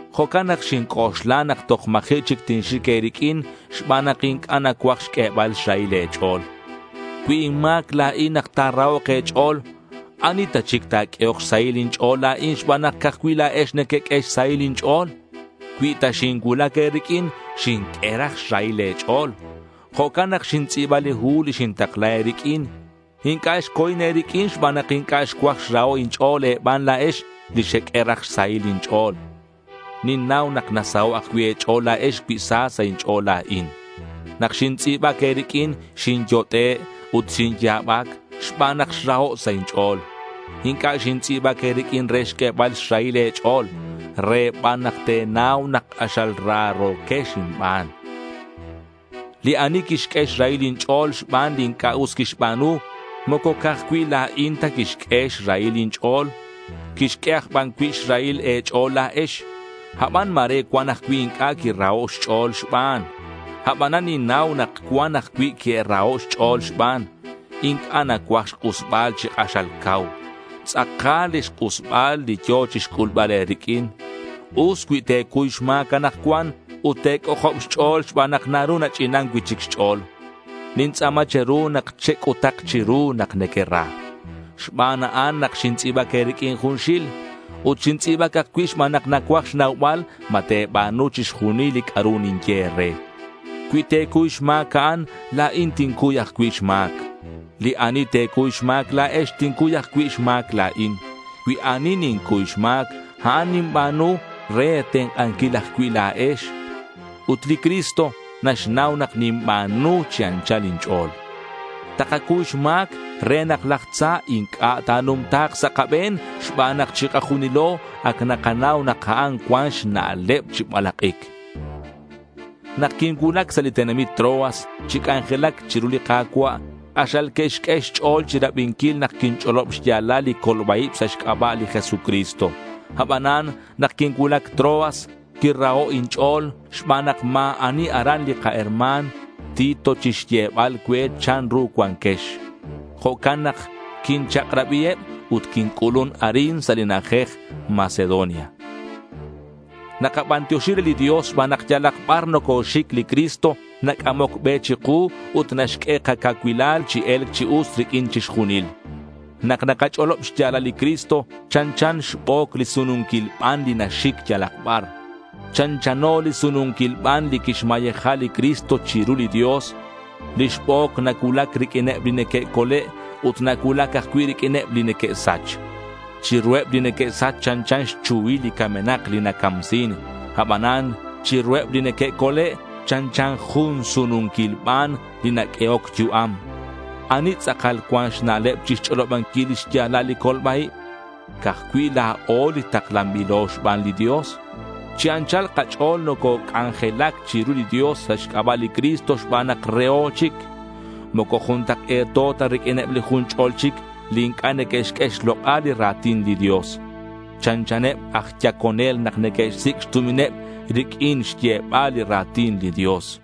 Jo'can nak xinc'oxla nak toj ma̱ji' chic tinxic e̱riq'uin xban nak inc'a' nacuaj xq'uebal xrahil e̱ch'o̱l. Cui inma̱c la̱in nak ta̱rahok' e̱ch'o̱l, ¿ani ta chic ta̱q'uehok xsahil inch'o̱l la̱in xban nak ca'aj cui' la̱ex nequeq'ue xsahil inch'o̱l? Cui ta xincuulac e̱riq'uin xinq'ue raj xrahil e̱ch'o̱l. Jo'can nak xintz'i̱ba li hu li xintakla e̱riq'uin. Inc'a' xco̱in e̱riq'uin xban nak inc'a' xcuaj xraho' inch'o̱l e̱ban la̱ex li xeq'ue raj xsahil inch'o̱l. Ninnau nak nasaho' ajcui' e̱ch'o̱l la̱ex cui sa sa' inch'o̱l la̱in. Nak xintz'i̱bac e̱riq'uin xinyot'e' ut xinya̱bac xban nak xraho' sa' inch'o̱l. Inc'a' xintz'i̱bac e̱riq'uin re xq'uebal xrahil e̱ch'o̱l. Re ban nak te̱nau nak k'axal raro̱quex inban. Li ani quixq'ue xrahil inch'o̱l xban li inc'a' us quixba̱nu, moco ca'aj cui' la̱in ta quixq'ue xrahil inch'o̱l. Quixq'ue aj ban cui' xrahil e̱ch'o̱l la̱ex. Aban ma̱re cuan ajcui' inc'a' quiraho' xch'o̱l xban. Abanan ninnau nak cuan ajcui' que'raho' xch'o̱l xban. Inc'a' nacuaj xk'usbal chi k'axal cau. Tz'akal lix k'usbal li yo̱ chixc'ulbal e̱riq'uin. Us cui te̱cuy xma̱c anakcuan ut te̱c'ojob xch'o̱l xban nak naru nach'inan cui'chic xch'o̱l. Nintz'a̱ma che̱ru nak chec'utak chiru nak nequera. Xban a'an nak xintz'i̱bac e̱riq'uin junxil. Ut xintz'i̱bac ajcui' xban nak nacuaj xnaubal ma te̱ba̱nu chixjunil li c'a'ru ninye e̱re. Cui te̱cuy xma̱c a'an la̱in tincuy ajcui' xma̱c. Li ani te̱cuy xma̱c la̱ex, tincuy ajcui' xma̱c la̱in. Cui ani nincuy xma̱c, a'an ninba̱nu re e̱tenk'anquil ajcui' la̱ex. Ut li Cristo naxnau nak ninba̱nu chi anchal inch'o̱l. Takacuy xma̱c re nak laj tza inc'a' ta̱numta̱k sa' kabe̱n xban nak chikajunilo ac nakanau nak a'an cuan xna'leb chi balak'ic. Nak quincuulac sa' li tenamit Troas chi c'anjelac chiru li Ka̱cua', k'axal que'xq'ue xch'o̱l chirabinquil nak quinch'olob xya̱lal li colba-ib sa' xc'aba' li Jesucristo. Abanan nak quincuulac Troas quiraho' inch'o̱l xban nak ma̱ ani aran li kaherma̱n Tito chixyebal cue chanru cuanquex. Jo'can nak quinchak'rabiheb ut quinc'ulun arin sa' li na'ajej Macedonia. Nakabantioxi re li Dios xban nak yalak bar nocoxic li Cristo nac'amoc be chiku ut naxq'ue kacuanquilal chi e̱lc chi us riq'uin chixjunil. Nak nakach'olob xya̱lal li Cristo, chanchan xbo̱c li sununquil ban li naxic yalak bar. Chanchano li sununquil ban li quixmayeja li Cristo chiru li Dios. Lix bo̱c nacuulac riq'uineb li neque'cole' ut nacuulac ajcui' riq'uineb li neque'sach. Chiruheb li neque'sach chanchan xchuhil li camenak li nacamsin. Abanan chiruheb li neque'cole' chanchan jun sununquil ban li naq'uehoc yu'am. ¿Ani tz'akal cuan xna'leb chixch'olobanquil li xya̱lal li colba-ib? Ca'aj cui' la̱o li taklanbilo xban li Dios. Chi anchal kach'o̱l nococ'anjelac chiru li Dios sa' xc'aba' li Cristo xban nak reho chic. Moco juntak'e̱to ta riq'uineb li jun ch'ol chic li inc'a' neque'xq'ue xlok'al li ra̱tin li Dios. Chanchaneb aj yaconel nak neque'xsic' xtumineb riq'uin xyebal li ra̱tin li Dios.